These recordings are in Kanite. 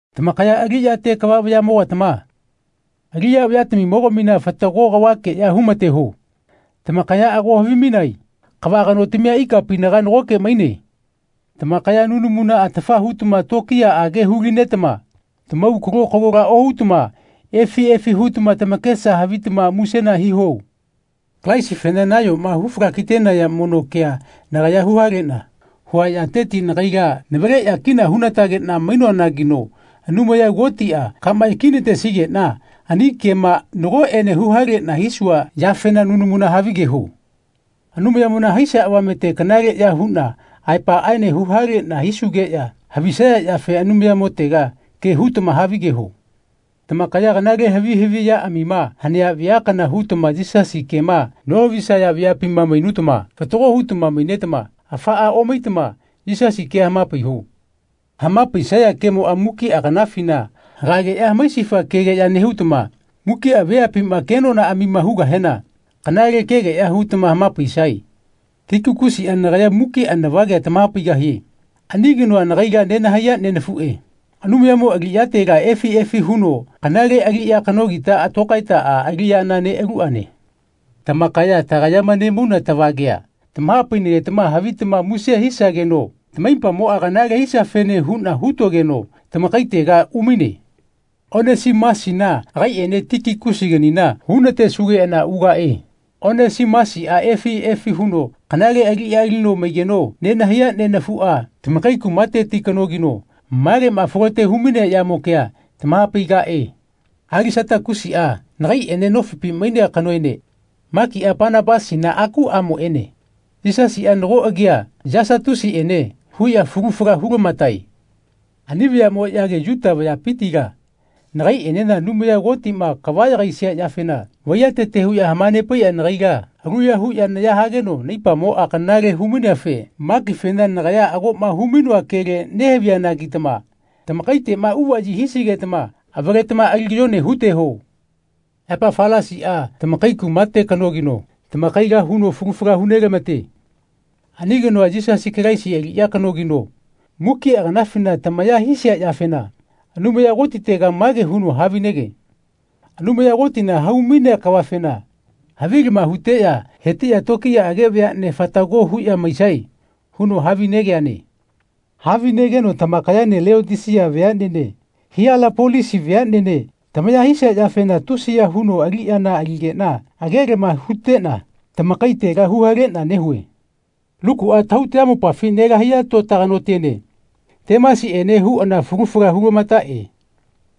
Tamakaya aliꞌyate kava vayaꞌmogatama aliꞌya vayatamimo-gamina fatago kavakeꞌya humateho. Tamakaya ago havimainae kava kanotamia ikapinaga nagoke maine. Tamakaya nunamuna atafa hutama tokiyaꞌage hu-linetama tamau kalo-kalola ohutama efi efi hutama tamakesa havitama musena hiho. Kalaisifena nayoma hu falakitenaya mono kea nagaya huhaleꞌna hua yateti nagaila navaleꞌya kina hunatageꞌna mainoanagino Anumaya Kotiꞌa kama yakinatesigeꞌna ani kema nagoꞌene huhaleꞌna hisua yafena nunamuna havigeho. Anumayamona haisia avamete kanaleꞌya huꞌna aepaꞌaene huhaleꞌna hisugeꞌya havisaya yafe Anumayamotega ke hutama havigeho. Tamakaya kanale havi haviꞌyaꞌamima hanea vea kana hutama Yisasi kema nohavisaya veapima mainutama fatago hutama mainetama afaꞌa omaitama Yisasi kea hamapaiho. Hamapaisaya kemoꞌa mukiꞌa kanafina hagageꞌya hamaisifa kegeꞌya nehutama mukiꞌa veapima kenonaꞌamima hugahena kanale kegeꞌya hutama hamapaisae. Tikikusiꞌa nagaya mukiꞌa navagea tamahapaigahie. Ani kanoa nagaila nenahaiya nenafuꞌe, Anumayamo aliꞌyatela efi efi huno kanale aliꞌya kanogita tokaetaꞌa aliꞌyana neꞌaluꞌane. Tamakaya tagayama nemauna tavagea tamaha-painagetama havitama muse hisageno tamaipamoꞌa kanale hisiafene huꞌna hutogeno tamakaitega umaine. Onesimusina agaiꞌene Tikikusiganina hunatesugeꞌana ugaꞌe. Onesimusiꞌa efi efi huno kanale aliꞌya alino maigeno nenahaiya nenafuꞌa, tamakai kumateti kanogino maleꞌma folote humainea yamo kea tamahapaigaꞌe. Alisatakusiꞌa nagaiꞌene nofipi mainea kanoene Makiꞌa Panapasina akuꞌamoꞌene Yisasiꞌa nago agia Yasatusiꞌene huꞌya falu fala hulamatae. Ani vayaꞌmoꞌyage Yuta vayapitila nagaiꞌenena Anumaya Kotiꞌma kava yagaisia yafena vaiyatete huꞌya hamanepaiꞌya nagaila aluya huꞌya naya hageno naipamoꞌa kanale humaineafe Makifena nagaya agoꞌma humainoa kele nehavianagitama tamakaiteꞌma uvaꞌyi hisigetama avaletama ali kayone huteho. Epafalasiꞌa tamakai kumate kanogino tamakaila huno falu fala hu nelamate. Ani kanoa Yisasi Kalaisi aliꞌya kanogino mukiꞌa kanafina tamaya hisia yafena Anumaya Kotitega mage huno havinege “Anumaya Kotina hau-mainea kavafena havilama huteꞌya hetiꞌya tokiyaꞌage veaꞌne fatago huꞌya maisae.” huno havinegeane. Havinegeno tamakayaene Leotisia veaꞌnene Hielapolisi veaꞌnene tamaya hisia yafena tusiya huno aliꞌyana aligeꞌna agelama huteꞌna tamakaitela huhaleꞌna nehue. Lukuꞌa tahau tayamopafi nelahaiya tota kanotiene Temasiꞌene huꞌana falu fala hulamataꞌe.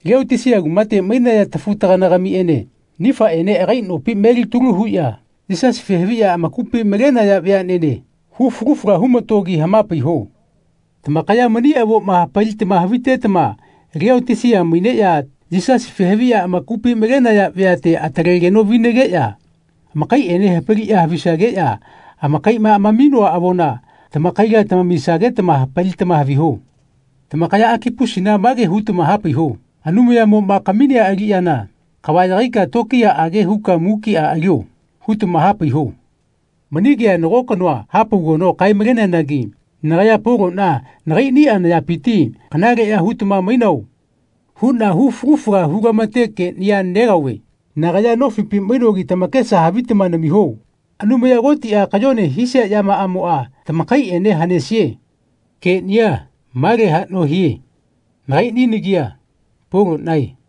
Leotisia kumate mainaya tafu-tagana-gamiꞌene Nifaene agai nopi melitalu huꞌya Yisasife haviꞌya amakupi malenaya veaꞌnene hu falu fala humatogi hamapaiho. Tamakaya mani avoma hapalitama havitetama Leotisia maineꞌya Yisasife haviꞌya amakupi malenaya veate atalegeno vinageꞌya amakaiꞌene hapaliꞌya havisageꞌya amakaiꞌma amaminoa avona tamakaila tamamisagetama hapalitama haviho. Tamakaya Akipusina mage hutama hapaiho “Anumayamoꞌma kaminea aliꞌyana kava yagaika tokiyaꞌage huka mukiꞌa alio.” hutama hapaiho. Mani kea nago kanoa hapaugeno kae-maleneanagi nagaya Poloꞌna nagaiꞌniꞌa nayapiti “Kanaleꞌya hutama mainao?” huꞌna hu falu fala hulamate keꞌnia negaove. Nagaya nofipi mainogi tamakesa havitama namiho. Anumaya Kotiꞌa kayone hisia yamaꞌamoꞌa tamakaiꞌene hanesie. Keꞌnia male haꞌno hie. Nagaiꞌni nagia Poloꞌnae.